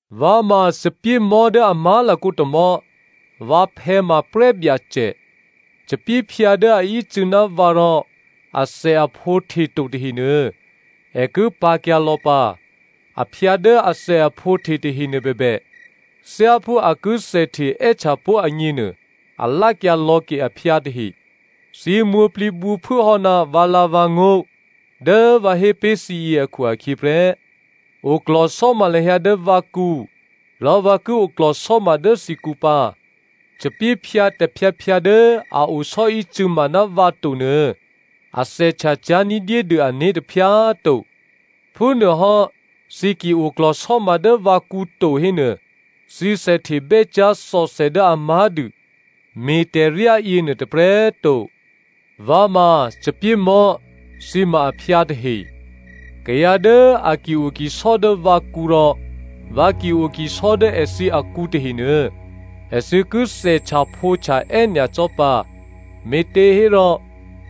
“Vǎ ma thòbǐthèmò̤́ dố a má̤lakǒ tômò̤́, vǎphè̌ ma prè́byacè. Thòbǐthèphyǎ dố a ícû̌ ná vǎ rò athèaphǒ hteto tahenuô, è ki pǎ̤kyǎ lò̌ pǎ. Aphyǎ dố athèaphǒhte tahenuô bèbè, thyáphú a ki thèhte è́htyapó̤ agněnuô a me̤lá̤kyǎ lò̌ke aphyǎ tahe. Thǐ mwǒ̤plǐbǔphuố hò́ ná vǎlǎ̤vǎngó̤ dố vǎ hé pé̤ thǐ yě akhu-akhyě prè́. Oklò̤sò́ma lahyǎ dố vǎkǔ rò vǎ ki oklò̤sò́ma dố thǐkǔ pǎ. Thòbǐthèphyǎ tôphyǎphyǎ dố a osò́ícû̌ma ná vǎ to nuô, a thèhtya cyá̤ ní̤dyédû ané̤ tôphyǎ꤮ to. Phúnuôhò́ thǐ ki oklò̤sò́ma dố vǎkǔ to hénuô, thǐ thèhtebè́ cyá̤ thòthè dố a má̤dû me̤tè̤ryá yěnuô tôprè̤꤮ to. “Vǎ ma thòbǐthèmò̤́, thǐ ma aphyǎ tahe. Kayǎ dố a ki-o kisò́ dố vǎkǔ rò vǎ ki-o kisò́ dố èthǐ akǔ tahenuô, èthǐ ki thèhtyaphǒhtya è́nyacò́ pǎ. Me̤těhérò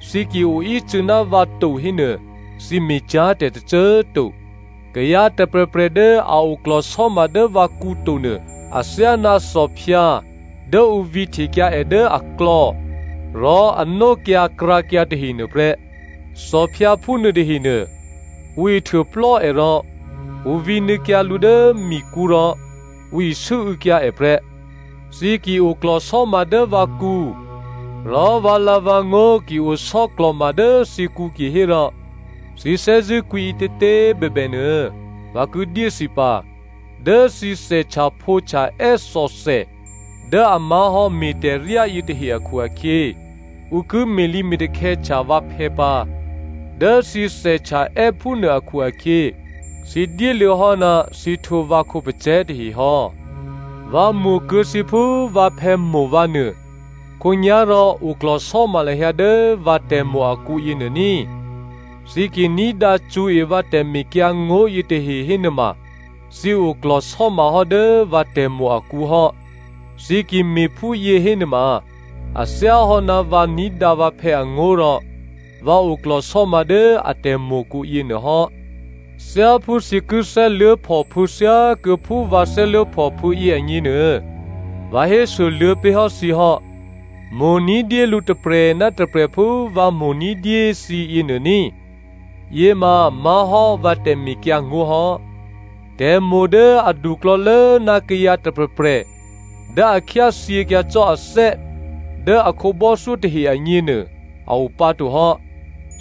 thǐ ki o ícû̌ ná vǎ to hénuô, thǐ me̤cyá̤ tè̤ tôcô꤮ to. Kayǎ tôprè̤prè̤ dố a oklò̤sò́ma dố vǎkǔ to nuô, athyáná thòphyǎ dố ǔ vǐhtekyǎ è dố aklò̌, rò a nókyǎkrǎkyǎ tahe nuôprè́. Thòphyǎ phúnuô tahenuô, ǔ ihtuôplò́ è rò ǔ vǐnuô̌kyǎ lǔ dố mikǔ rò ǔ isû́û̌kyǎ è prè́. Thǐ ki oklò̤sò́ma dố vǎkǔ, rò vǎlǎ̤vǎngó̤ ki osò́klò̤ma dố thǐkǔ kihérò thǐ thè́zṳ̂́kwǐ ǐtětě꤮ bèbè nuô, vǎ ki dyé thǐ pǎ. Dố thǐ thèhtyaphǒhtya è́ thòthè dố a má̤hò́ me̤tè̤ryá yětahe akhu-akhyě, ǔ ki me̤lǐme̤takhè̌htya vǎphè̌ pǎ. Dố thǐ thèhtyaè́ phúnuô akhu-akhyě thǐ dyéluô̌hò́ ná thǐ htwǒ vǎ khǒpacè̤̌ tahe hò́. “Vǎ mo̤kuô̌ thǐ phú vǎphè̌ mo̤ vǎ nuô, khǒnyá̤rò oklò̤sò́ma lahyǎ dố vǎ tè̤mo̤ akǔ yěnuô ní꤮. Thǐ ki ní̤dǎ cṳ̌e vǎ tè̤mekyǎngó̤ yětahe hénuôma thǐ oklò̤sò́ma hò́ dố vǎ tè̤mo̤ akǔ hò́. Thǐ ki me̤ phúyě hénuôma a thyáhò́ ná vǎ ní̤dǎ vǎphè̌ angó̤ rò vǎ oklò̤sò́ma dố a tè̤mo̤kǔ yěnuô hò́. Thyáphú thǐ ki thè́luố̤phòphû̌ thyákuô̌ phú vǎ thè́luố̤phòphû̌ yě agněnuô, vǎ hésoluô̌ pé̤ hò́ thǐ hò́. Mo̤ ní̤dyé lǔ tôprè̤ ná tôprè̤ phú vǎ mo̤ ní̤dyé thǐ yěnuô ní꤮, yěma má̤hò́ vǎ tè̤mekyǎngó̤ hò́. Tè̤mo̤ dố aduklò̌lố ná kayǎ tôprè̤prè̤ dố a khyáthyěkyǎ cò́ athè́ dố a khǒbò́thyó tahe agněnuô a o pǎ to hò́.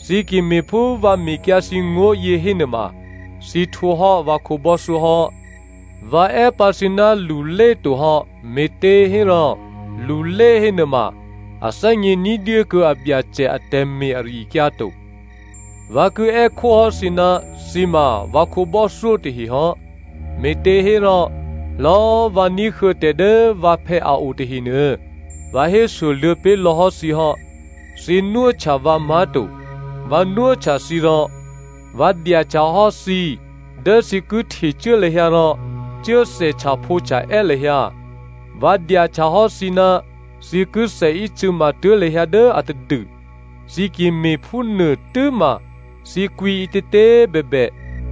Thǐ ki me̤ phú vǎ mekyǎ thǐ ngó̤ yě hénuôma, thǐ htwǒhò́ vǎ khǒbò́thyó hò́. Vǎ è́ pǎ thǐ ná lulé to hò́, me̤těhérò lulé hénuôma a thè́gně ní̤dyé kuô̌ abyacè atè̤me̤ ari-akyǎ to. Vǎ ki è́khó hò́ thǐ ná thǐ ma vǎ khǒbò́thyó tahe hò́, me̤těhérò lò̌꤮ vǎ ní̤huô̌ tè̤ dố vǎphè̌ a o tahenuô, vǎ hésoluô̌ pé̤lò̌hò́ thǐ hò́. Thǐ nwóhtya vǎ má̤to. Vǎ nwóhtya thǐ rò vǎ dyahtyahò́ thǐ dố thǐ ki htecuố lahyǎ rò cuố thèhtyaphǒhtya è́ lahyǎ. Vǎ dyahtyahò́ thǐ ná thǐ ki thèícû̌matuố̤ lahyǎ dố atadû. Thǐ ki me̤phúnuô tû́ma thǐ kwǐ ǐtětě꤮ bèbè,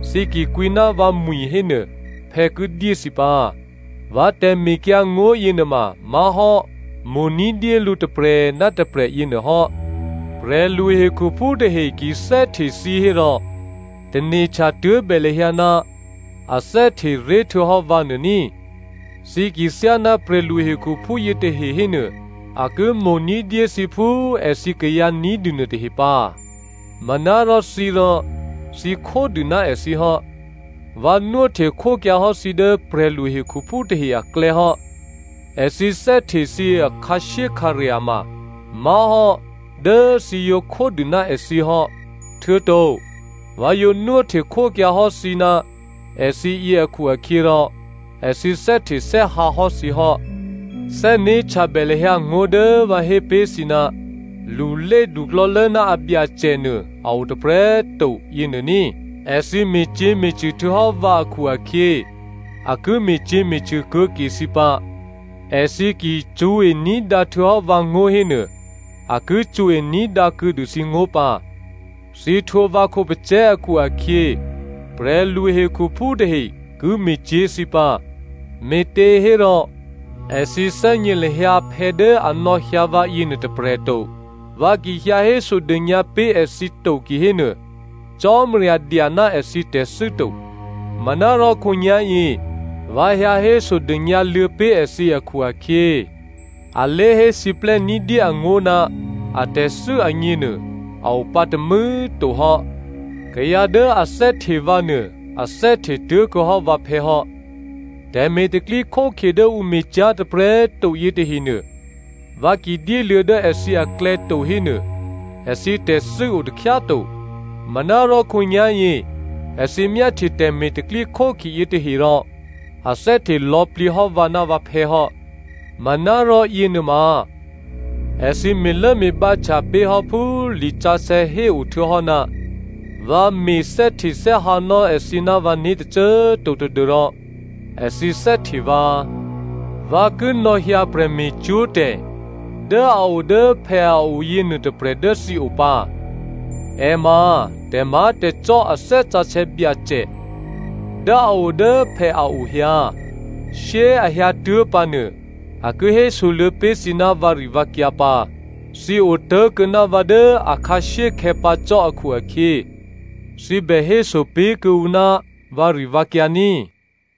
thǐ ki kwǐ ná vǎmwi̤ hénuô, phè̌ ki dyé thǐ pǎ. Vǎ tè̤mekyǎngó̤ yěnuôma má̤hò́ mo̤ ní̤dyé lǔ tôprè̤ ná tôprè̤ yěnuôhò́.” “Prè̤lu hekhuphú tahe ki thè́hte thǐ hérò tane̤htya tuố̤bè lahyǎ ná a thè́hte ré̤htuô̌hò́ vǎ nuô ní꤮. Thǐ ki thyáná prè̤lu hekhuphú yětahe hénuô, a ki mo̤ ní̤dyé thǐ phú èthǐ kayǎ ní̤dû nuôtahe pǎ. Manárò thǐ rò, thǐ khódû ná èthǐ hò́. Vǎ nwóhtekhókyǎ hò́ thǐ dố prè̤lu hekhuphú tahe aklè̌ hò́. Èthǐ thè́hte thǐ akhǎshyékhǎrya̤ ma má̤hò́ dố thǐ yǒ khódû ná èthǐ hò́, htuô̌to vǎ yǒ nwóhtekhókyǎ hò́ thǐ ná èthǐ yě akhu-akhyěrò èthǐ thè́htethè́hǎ hò́ thǐ hò́. Thè́né̤htyabè lahyǎ ngó̤ dố vǎ hé pé̤ thǐ, ‘Lulé duklò̌lố ná abyacè nuô a o tôprè̤꤮ to,’ yěnuô ní꤮. Èthǐ me̤cyě̤me̤cṳ̂ htuô̌hò́ vǎ akhu-akhyě, a ki me̤cyě̤me̤cṳ̂ kuô̌ ke thǐ pǎ. Èthǐ ki cṳ̌e ní̤dǎ htuô̌hò́ vǎngó̤ hénuô, a ki cṳ̌e ní̤dǎ kuô̌dû thǐngó̤ pǎ. Thǐ htwǒ vǎ khǒpacè̤̌ akhu-akhyě prè̤lu hekhuphú tahe ki me̤cyě̤ thǐ pǎ, me̤těhérò èthǐ thè́gně lahyǎ phè̌ dố a nò̌hyǎ vǎ yěnuô tôprè̤ to. Vǎ ki hyǎ hésodônyǎ pé̤ èthǐ to kihénuô, Cò́marya dya ná èthǐ tè̤thû́ to. Manárò khǒnyá̤yě vǎ hyǎ hésodônyǎ luô̌ pé̤ èthǐ akhu-akhyě, alé̤hé siplè́ ní̤dyé angó̤ ná atè̤thû́ agněnuô a opǎ tômû̌꤮ to hò́. Kayǎ dố a thè́hte vǎ nuô a thè́hte tuố̤kuô̌hò́ vǎphè̌ hò́. Tè̤me̤ tè̤pro̤tè̤prya̤ dố ǔ me̤cyá̤ tôprè̤꤮ to yětahenuô, vǎ ki dyéluô̌ dố èthǐ aklè̌ to hénuô, èthǐ tè̤thû́ o takhyá꤮ to. Manárò, khǒnyá̤yě, èthǐ myáhtye tè̤me̤ tè̤pro̤tè̤prya̤ yětahe rò a thè́hte lò̌plǐ hò́ vǎ ná vǎphè̌ hò́. Manárò yěnuôma, èthǐ me̤lốme̤bǎhtya pé̤hò́ phú lisǎsè̌ héo htuô̌hò́, ‘Vǎ me̤ thè́htethè́hǎnò́ èthǐ ná vǎné̤ tôcô꤮ to tadû́rò èthǐ thè́hte vǎ.’ “Vǎ ki nò̌hyǎ prè̤me̤cwó̤tè̤ dố a o dố phè̌o yěnuô tôprè̤ dố thǐ o pǎ. È ma tè̤má̤tè̤cò́ a Thè́ Sǎsè̌ Byacè dố a o dố phè̌ a o hyǎ. Shyé꤮ a hyǎtuố̤ pǎnuô, a ki hésoluô̌ pé̤ thǐ ná vǎrivǎkyǎ pǎ. Thǐ otố̤kuô̌ ná vǎ dố akhǎshyékhè̌ pǎ cò́ akhu-akhyě thǐ bè héso pé̤ kuô̌ǔ ná vǎrivǎkyǎ ní꤮.”